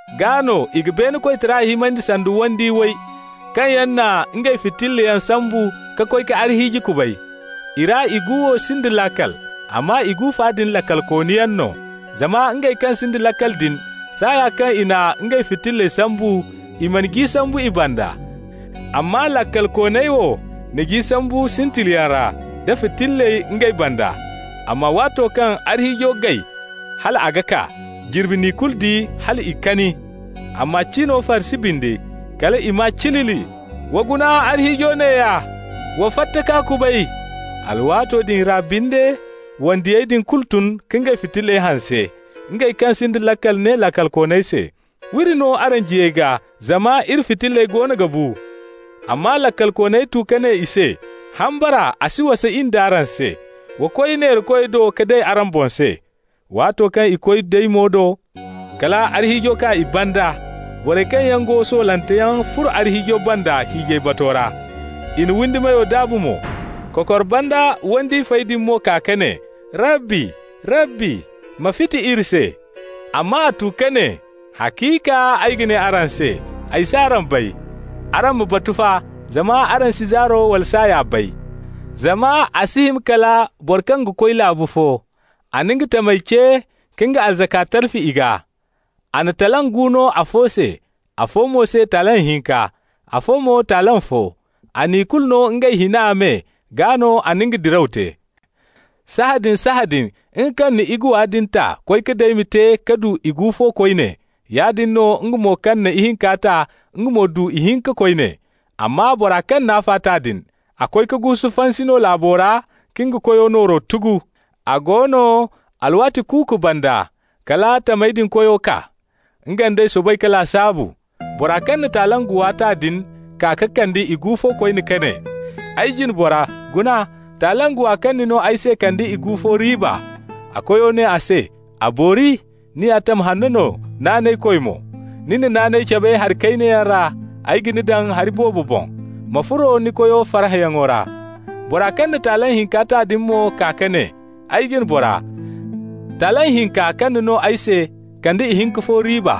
Gaa no i ga beene koytara himandi sanda wandiyo way kaŋ yaŋ na ngey fitillayaŋ sambu ka koy ka arhiiji kubay. I ra igu wo sinda laakal, amma igu fa din laakalkooniyaŋ no. Zama ngey kaŋ sinda laakal din, saaya kaŋ i na ngey fitilley sambu, i mana ji sambu i banda. Amma laakalkooney wo na ji sambu sintiliyaŋ ra, da fitilley ngey banda. Amma waato kaŋ arhiijo gay hal a ga kaa, jirbi n'i kulu di hal i kani. Amma cino farsi bindi, kal i maa cilili: ‹Wa guna, arhiijo neeya! Wa fatta k'a kubay!› Alwaato din ra binde, wandiyey din kulu tun ka ngey fitilley hanse. Ngey kaŋ sinda laakal ne laakalkooney se: ‹W'iri no araŋ jiyey gaa, zama iri fitilley goono ga bu.› Amma laakalkooney tu ka ne i se: ‹Hambara a si wasa in d'araŋ se. Wa koy neerakoy do ka day araŋ boŋ se.› Waato kaŋ i koy daymo do, kal arhiijo kaa i banda. Borey kaŋ yaŋ go soolanteyaŋ furo arhiijo banda hiijay bato ra. I na windi meyo daabu mo. Kokor banda wandiyo fey din mo kaa ka ne: ‹Rabbi, Rabbi, ma fiti iri se!› Amma a tu ka ne: ‹Haciika, ay ga ne araŋ se: ay s'araŋ bay.› Araŋ ma batu fa, zama araŋ si zaaro wala saaya bay! Zama a si hima kala boro kaŋ ga koy laabu fo. A na nga tamey ce ka nga arzaka talfi i gaa. A na talent gu no afo se, afo mo se talent hinka, afo mo talent fo. A n'i kulu no ngey hina me, gaa no a na nga diraw te. Sahãadin-sahãadin nga kaŋ na iguwa din ta koy ka daymi te ka du igu fo koyne. Yaadin no nga mo kaŋ na ihinka ta, nga mo du ihinka koyne. Amma bora kaŋ n'afa ta din, a koy ka guusu fansi no laabo ra ka nga koyo nooro tugu. A go no, alwaati kuuku banda, kala tamey din koyo kaa. Nga nd'ey soobay ka lasaabu. Bora kaŋ na talent guwa ta din kaa ka kande igu fo koyne ka ne: ‹Ay jine bora, guna, talent guwa kaŋ ni no ay se kande igu fo riiba.› A koyo ne a se: ‹A boori! Ni ya tam hanno no, naanaykoy mo. Ni na naanay cabe hari kayna yaŋ ra, ay ga ni daŋ hari boobo boŋ. Ma furo ni koyo farhãyaŋo ra.› Bora kaŋ na talent hinka ta din mo kaa ka ne: ‹Ay jine bora, talent hinka kaŋ ni no ay se kande ihinka fo riiba.›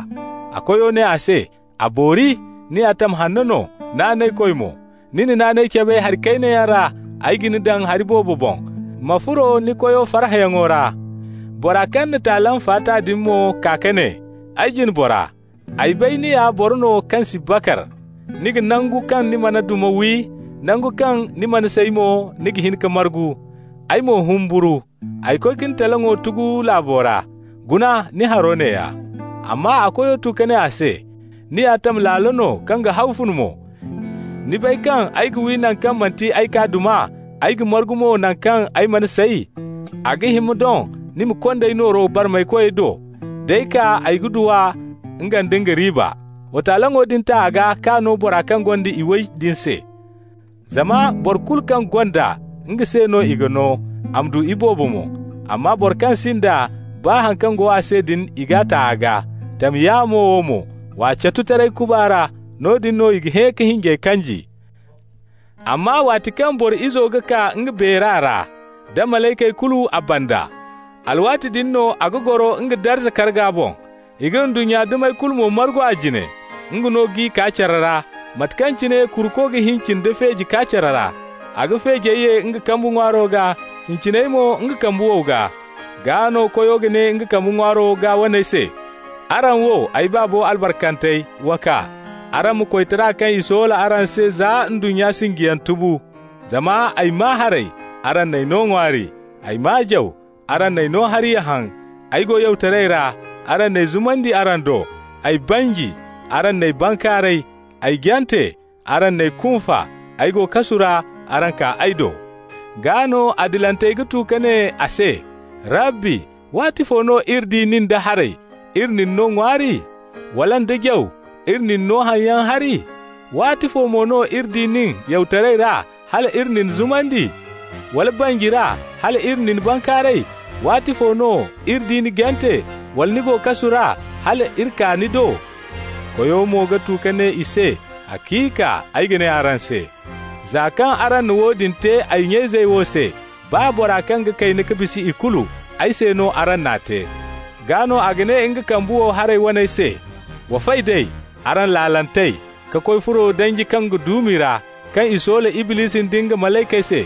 A koyo ne a se: ‹A boori! Ni ya tam hanno no, naanaykoy mo. Ni na naanay cabe hari kayna yaŋ ra, ay ga ni daŋ hari boobo boŋ. Ma furo ni koyo farhãyaŋo ra.› Bora kaŋ na talent fa ta din mo kaa ka ne: ‹Ay jine bora, ay bay ni ya boro no kaŋ si bakar. Ni ga nangu kaŋ ni mana duma wi, nangu kaŋ ni mana say mo, ni ga hin ka margu. Ay mo humburu. Ay koy ka ni taleŋo tugu laabo ra. Guna ni haro neeya.› Amma a koyo tu ka ne a se: ‹Ni ya tam laalo no, kaŋ ga hawfun mo! Ni bay kaŋ ay ga wi naŋ kaŋ manti ay k'a duma, ay ga margu mo naŋ kaŋ ay mana say. A ga hima doŋ ni ma kond'ay nooro barmaykoy do. D'ay kaa ay ga du a, nga nda nga riiba. Wa taleŋo din ta a gaa k'a no bora kaŋ gonda iway din se. Zama boro kulu kaŋ gonda, nga se no i ga no, a ma du iboobo mo. Amma boro kaŋ sinda, baa haŋ kaŋ go a se din, i g'a ta a gaa. Tam yaamo wo mo, w'a catu taray kuba ra. Noodin no i ga hẽ ka hinjey kanji.› Amma waati kaŋ Boro Izo ga kaa nga beera ra, da malaykey kulu a banda, alwaati din no a ga goro nga darza karga boŋ. I ga ndunnya dumey kulu mo margu a jine. Nga no g'i kaa care ra, mate kaŋ cine kuruko ga hincin da feeji kaa care ra. A ga feejey ye nga kambe ŋwaaro gaa, hinciney mo nga kambe wow gaa. Gaa no Koyo ga ne nga kambe ŋwaaro gaa waney se: ‹Araŋ wo ay Baabo albarkantey, wa kaa! Araŋ ma koytara kaŋ i soola araŋ se za ndunnya sinjiyaŋ tubu. Zama ay maa haray, araŋ n'ay no ŋwaari. Ay maa jaw, araŋ n'ay no hari ya haŋ. Ay go yawtaray ra, araŋ n'ay zumandi araŋ do. Ay banji, araŋ n'ay bankaaray. Ay jante, araŋ n'ay kunfa. Ay go kasu ra, araŋ kaa ay do.› Gaa no adilantey ga tu ka ne a se: ‹Rabbi, waatifo no iri di nin da haray, iri na ni no ŋwaari? wala nda jaw, iri na ni no haŋyaŋ hari? Waatifo mo no iri di nin yawtaray ra, hal iri na ni zumandi? wala banji ra, hal iri na ni bankaaray? Waatifo no iri di ni jante, wala ni go kasu ra, hala iri kaa ni do?› Koyo mo ga tu ka ne i se: ‹Haciika, ay ga ne araŋ se: za kaŋ araŋ na woodin te ay nya-izey wo se, baa bora kaŋ ga kayna ka bisa ikulu, ay se no araŋ n'a te.› Gaa no a ga ne nga kambe wow haray waney se: ‹Wa fay d'ay, araŋ laalantey, ka koy furo danji kaŋ ga duumi ra, kaŋ i soola Iblisi nda nga malaykey se.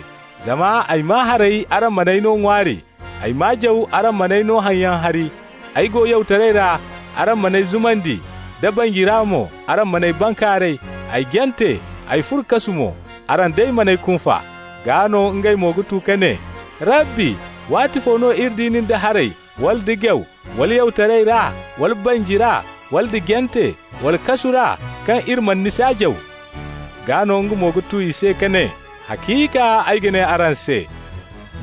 Zama ay maa haray, araŋ man'ay no ŋwaari. Ay maa jaw, araŋ man'ay no haŋyaŋ hari. Ay go yawtaray ra, araŋ man'ay zumandi, da banji ra mo, araŋ man'ay bankaaray. Ay jante, ay furo kasu mo, araŋ day man'ay kunfa.› Gaa no ngey mo ga tu ka ne: ‹Rabbi, waatifo no iri di nin da haray, wala da jaw, wala yawtaray ra, wala banji ra, wala nda jante, wala kasu ra, kaŋ iri mana ni saajaw?› Gaa no nga mo ga tu i se ka ne: ‹Haciika, ay ga ne araŋ se: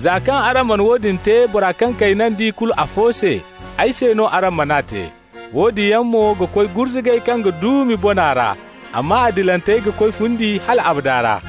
za kaŋ araŋ mana woodin te bora kaŋ kayna nda ikulu afo se, ay se no araŋ man'a te.› Woodin yaŋ mo ga koy gurzugay kaŋ ga duumi bona ra, amma adilantey ga koy fundi hal abada ra.»